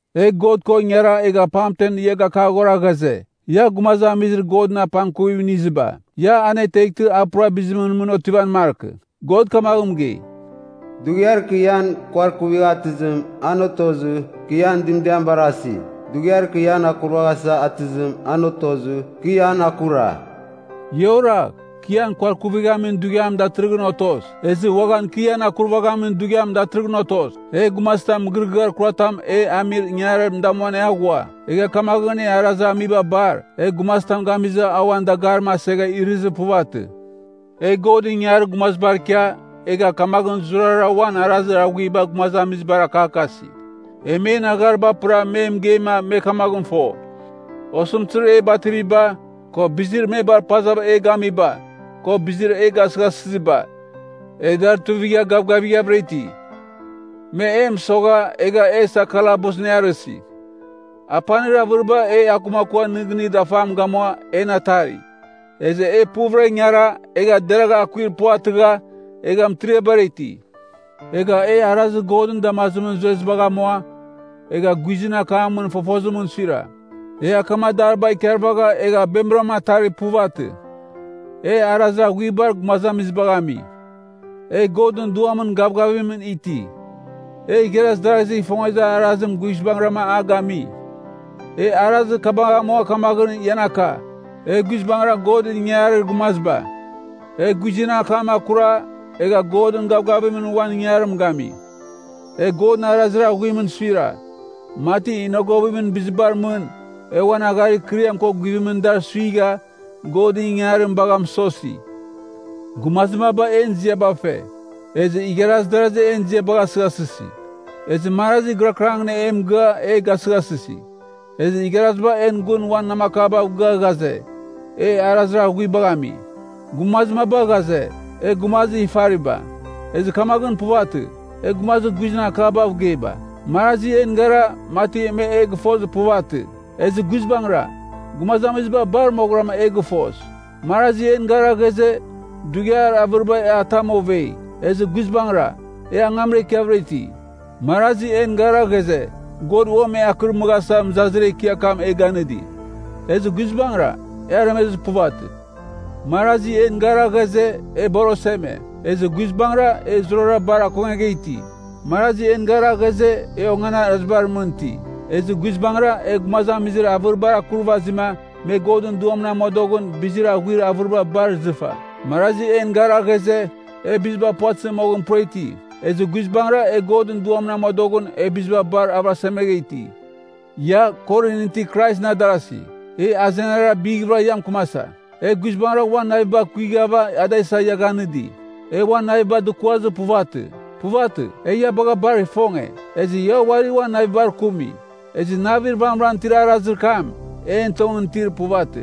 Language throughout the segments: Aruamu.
E God ko ingara egha pamten ia gakaghora ghaze, ia gumazamizir Godɨn apangkuvim iniziba, ia aneteghtɨ a pura bizimɨn mɨn otivan markɨ. God kamaghɨn mɨgei, “Dughiar kɨ ian kuarkuvigha atɨzim, an otozɨ, kɨ ian dɨmdiam barasi. Dughiar kɨ ian akurvaghasa atɨzim, an otozɨ, kɨ ian akura.” Ia oragh! Kɨ ian kuarkuvighamin dughiam datɨrɨghɨn otos. Ezɨ uaghan kɨ ian akurvaghamin dughiam datɨrɨghɨn otos! E gumazitam mɨgɨrɨgɨar kuratam e amir ingangarim damuan e aghua, egha kamaghɨn en arazir amiba bar, e gumazitam gamizɨ a uan dagarim asegha irɨzir puvatɨ. E Godɨn ingangarir gumazibar ikia, egha kamaghɨn zurara uan arazir aghuiba gumazamizibar akakasi. E men aghariba apɨra me mɨgeima me kamaghɨn fo: Osɨmtɨzir e bativiba, ko bizir me bar pazava e gamiba, ko bizir e gasɨghasɨziba, e dar tuivigha gavgavighavɨra iti. Me e mɨsogha, egha e isa kalabusɨn e arɨsi. Apanir avɨriba e akumakua nɨgɨnir dafam gamua en atari. Ezɨ e puvɨra ingara, egha deragha akuir puvatɨgha, egha mɨtiriabara iti. Egha e arazir Godɨn damazimɨn zuezibagh amua, egha guizɨn akamɨn fofozimɨn suira. E akamadariba ikarvagha egha bemɨram atarir puvatɨ. E arazir aghuibar gumazamizibagh ami. E Godɨn Duamɨn gavgavim iti. E igharaz darazigh ifongezir arazim guizbangɨram a gami. E arazir kabagh amua kamaghɨn ian aka, e guizbangɨra Godɨn ingangarir gumaziba. E guizɨn akam akura, egha Godɨn gavgavimɨn uan ingangarim gami. E Godɨn arazir aghuimɨn suira, mati inogovimɨn bizibar mɨn, e uan agharir ikɨriam ko guvimɨn dar suigha, Godɨn ingangarim bagha mɨsosi. Gumazir maba en ziaba fe. Ezɨ igharaziba en ziabagh asɨghasɨsi. Ezɨ marazi gɨrakɨrangɨn e mɨgɨa e gasɨghasɨsi, ezɨ igharaziba en gun uan namakabav gɨa ghaze, e arazir aghuibagh ami. Gumazir maba ghaze, e gumazir ifariba. Ezɨ kamaghɨn puvatɨ, e gumazir guizɨn akabav geiba. Marazi en gara, mati me e gɨfozir puvatɨ. Ezɨ guizbangɨra, gumazamiziba bar moghɨram e gɨfos. Marazi en gara ghaze, dughiar avɨriba e atam ovei. Ezɨ guizbangɨra, e angamra ikiavɨra iti. Marazi en gara ghaze, God uam e akɨrmɨghasa mɨzazir ekiar kam e ganɨdi. Ezɨ guizbangɨra, e aremezir puvatɨ. Marazi en gara ghaze, e bar oseme. Ezɨ guizbangɨra, e zurara bar akongegha iti. Marazi en gara ghaze, e onganarazibar mɨn iti. Ezɨ guizbangɨra, e gumazamizir avɨribar akurvazima, me Godɨn Duamɨn amodoghɨn, bizir aghuir avɨriba bar izɨfa. Marazi en gara ghaze, e biziba puvatɨzɨ moghɨn pura iti. Ezɨ guizbangɨra, e Godɨn Duamɨn amodoghɨn, e biziba bar avɨrasemegha iti. Ia, Korinɨn itir Kraisɨn adarasi, e azenara bighvɨra ia mɨkɨmasa. E guizbangɨra uan naviba kuighava da isa ia ganɨdi. E uan naviba dukuazir puvatɨ. Puvatɨ, e ia bagha bar ifonge. Ezɨ ia uari uan navibar kumi. Ezɨ navir vamɨran itir arazir kam, en tongɨn itir puvatɨ.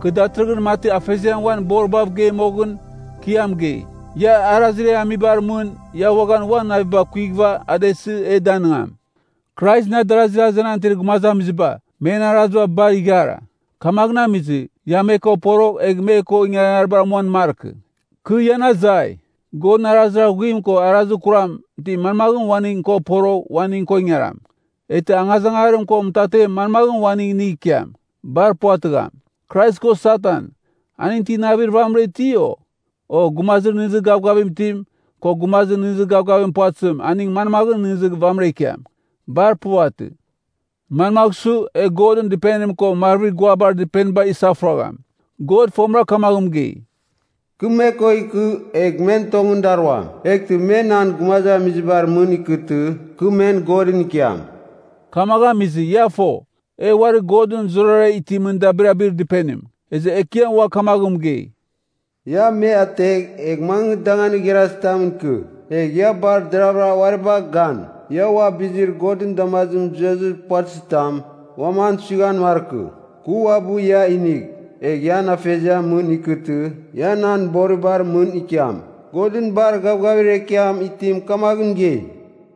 Kɨ datɨrɨghɨn mati Afeziam uan boribav gei moghɨn, kɨ ia mɨgei. Ia arazir e amibar mɨn, ia uaghan uan naviba kuighɨva da isɨ e danɨngam. Kraisɨn adarazir azenan itir gumazamiziba, men araziba bar ighara. Kamaghɨn amizɨ, ia me ko porogh egh me ko ingangaribar amuan markɨ. Kɨ ian azai, Godɨn arazir aghuim ko arazir kuram ti manmaghɨn uaning ko porogh uaning ko ingaram? Eghtɨ angazangarim ko mɨtatem manmagh uaning inigh ikiam? Bar puvatɨgham. Krais ko Satan, aning ti navir vamɨran iti, o? O, gumazir nɨghnɨzir gavgavim itim, ko gumazir nɨghnɨzir gavgavim puvatɨzim aning manmaghɨn nɨghnɨzir vamɨra ikiam? Bar puvatɨ. Manmagh su, e Godɨn Dɨpenim ko marvir guabar dɨpeniba isafuragham? God fomira kamagh mɨgei, “Kɨ me ko ikɨ, egh men tongɨn daruam. Eghtɨ me nan gumazamizibar mɨn ikɨtɨ, kɨ men Godɨn ikiam.” Kamaghɨn amizɨ, ia fo, e uari Godɨn zurara itimɨn dabirabir Dɨpenim. Ezɨ Ekiam ua kamaghɨn mɨgei, “‘Ia me ategh, egh mangɨ danganir igharazitamɨn ikɨ. Egh ia bar deraghvɨra uari bagh gan, ia ua bizir Godɨn damazimɨn zuezir puvatɨzitam uam an suighan markɨ. Kɨ uabɨ ia inigh, egh ian Afeziamɨn mɨn ikɨtɨ, ia nan boribar mɨn ikiam.’ Godɨn bar gavgavir ekiam itim kamaghɨn mɨgei.”